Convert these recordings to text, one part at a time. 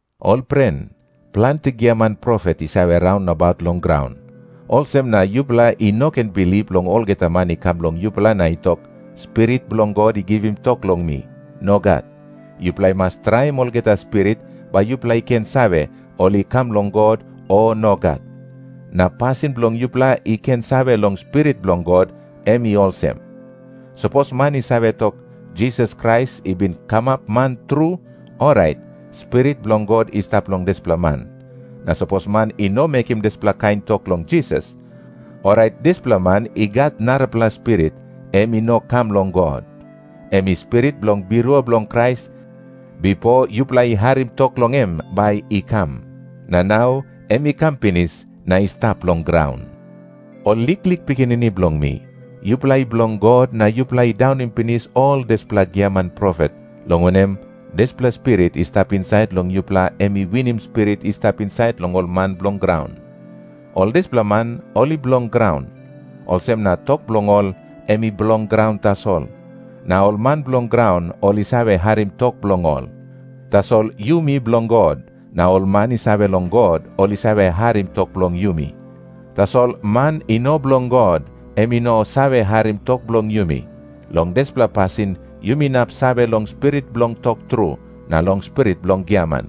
Ol pren, planti giaman profet i save raun nabaut long graun. Olsem na yupela i no ken bilip long olgeta man i kam long yupela na i tok, "Spirit bilong God i givim tok long mi." Nogat. Yupela i mas traim olgeta spirit, bai yupela i ken save, ol i kam long God, o nogat. Na pasin bilong yupela i ken save long Spirit bilong God, em i olsem. Sapos man i save tok, "Jisas Krais i bin kamap man tru," orait Spirit bilong God i stap long dispela man. Na sapos man i no mekim dispela kain tok long Jisas, orait dispela man i gat narapela spirit, em i no kam long God. Em i spirit bilong birua bilong Krais, bipo yupela i harim tok long em bai i kam. Na nau em i kam pinis na i stap long graun. Ol liklik pikinini bilong mi, yupela i bilong God, na yupela i daunim pinis ol dispela giaman profet, long wanem, dispela Spirit i stap insait long yupela em i winim spirit i stap insait long ol man bilong graun. Ol dispela man ol i bilong graun. Olsem na tok bilong ol em i bilong graun tasol, na ol man bilong graun ol i save harim tok bilong ol. Tasol yumi bilong God, na ol man i save long God, ol i save harim tok bilong yumi. Tasol man i no bilong God, em i no save harim tok bilong yumi. Long dispela pasin yumi inap save long Spirit bilong tok tru, na long spirit bilong giaman.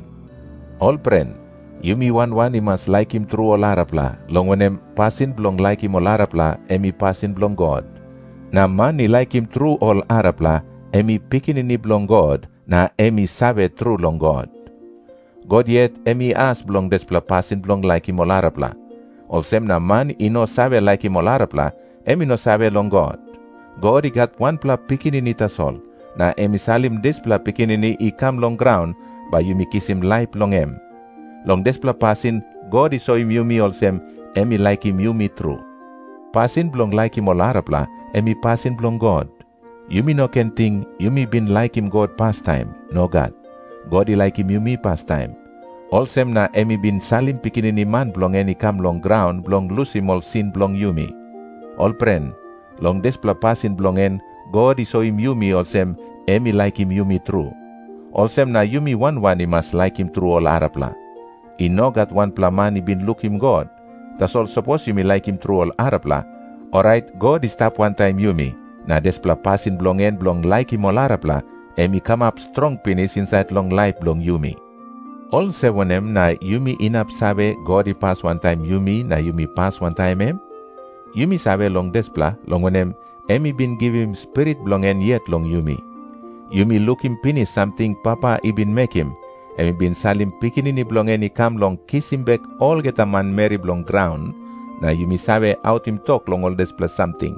Ol pren, yumi wan wan i mas laikim tru ol arapela, long wanem, pasin bilong laikim ol arapela em i pasin bilong God. Na man i laikim tru ol arapela, em i pikinini bilong God, na em i save tru long God. God yet em i as bilong dispela pasin bilong laikim ol arapela. Olsem na man i no save laikim ol arapela, em i no save long God. God i gat wanpela Pikinini tasol, na em i salim dispela Pikinini i kam long graun, bai yumi kisim laip long em. Long dispela pasin God i soim yumi olsem em i laikim yumi tru. Pasin bilong laikim ol arapela, em i pasin bilong God. Yumi no ken ting, yumi bin laikim God pastaim. Nogat. God i laikim yumi pastaim. Olsem na em i bin salim Pikinini Man bilong en i kam long graun bilong lusim ol sin bilong yumi. Ol pren, long dispela pasin bilong en God i soim yumi olsem em i laikim yumi tru. Olsem na yumi wan wan i mas laikim tru ol arapela. I no gat wanpela man i bin lukim God. Tasol sapos yumi laikim tru ol arapela, orait God i stap wantaim yumi, na dispela pasin bilong en bilong laikim ol arapela, em i kamap strong pinis insait long laip bilong yumi. Olsem wanem na yumi inap save, God i pas wantaim yumi na yumi pas wantaim em? Yumi save long dispela, long wanem, em i bin givim Spirit bilong em yet long yumi. Yumi lukim pinis samting Papa i bin mekim. Em i bin salim Pikinini bilong en i kam bilong kisim bek olgeta manmeri bilong graun, na yumi save autim tok long ol dispela samting.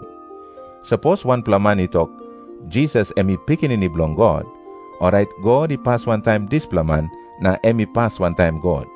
Sapos wanpela man i tok, "Jisas em i Pikinini Bilong God," orait God i pas wantaim dispela man, na em i pas wantaim God.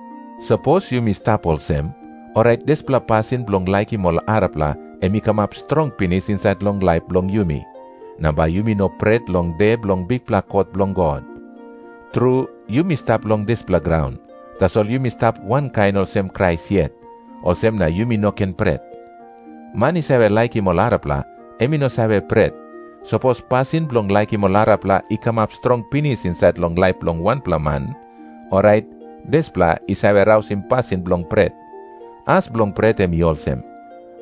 Sapos yumi stap olsem, orait dispela pasin bilong laikim ol arapela em i kamap strong pinis insait long laip bilong yumi. Na bai yumi no pret long de bilong bikpela kot bilong God. Tru, yumi stap long dispela graun, tasol yumi stap wankain olsem Krais yet, olsem na yumi no ken pret. Man i save laikim ol arapela, em i no save pret. Sapos pasin bilong laikim ol arapela i kamap strong pinis insait long laip bilong wanpela man, orait dispela i save rausim pasin bilong pret. As bilong pret em i olsem.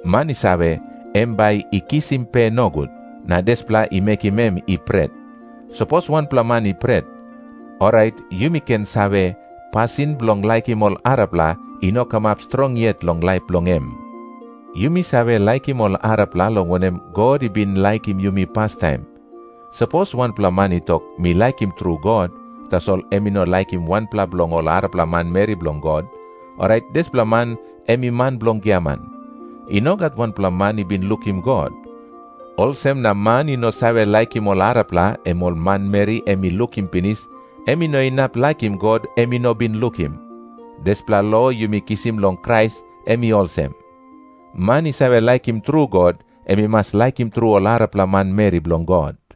Man i save, em bai i kisim pe nogut, na dispela i mekim em i pret. Sapos wanpela man i pret, orait yumi ken save, pasin bilong laikim ol arapela i no kamap strong yet long laip bilong em. Yumi save laikim ol arapela, long wanem, God i bin laikim yumi pastaim. Sapos wanpela man i tok, "Mi laikim tru God," tasol em i no laikim wanpela bilong ol arapela manmeri bilong God, orait dispela man em i man bilong giaman. I no gat wanpela man i bin lukim God. Olsem na man i no save laikim ol arapela, em ol manmeri em i lukim pinis, em i no inap laikim God em i no bin lukim. Dispela lo yumi kisim long Krais, em i olsem. Man i save laikim tru God, em i mas laikim tru ol arapela manmeri bilong God.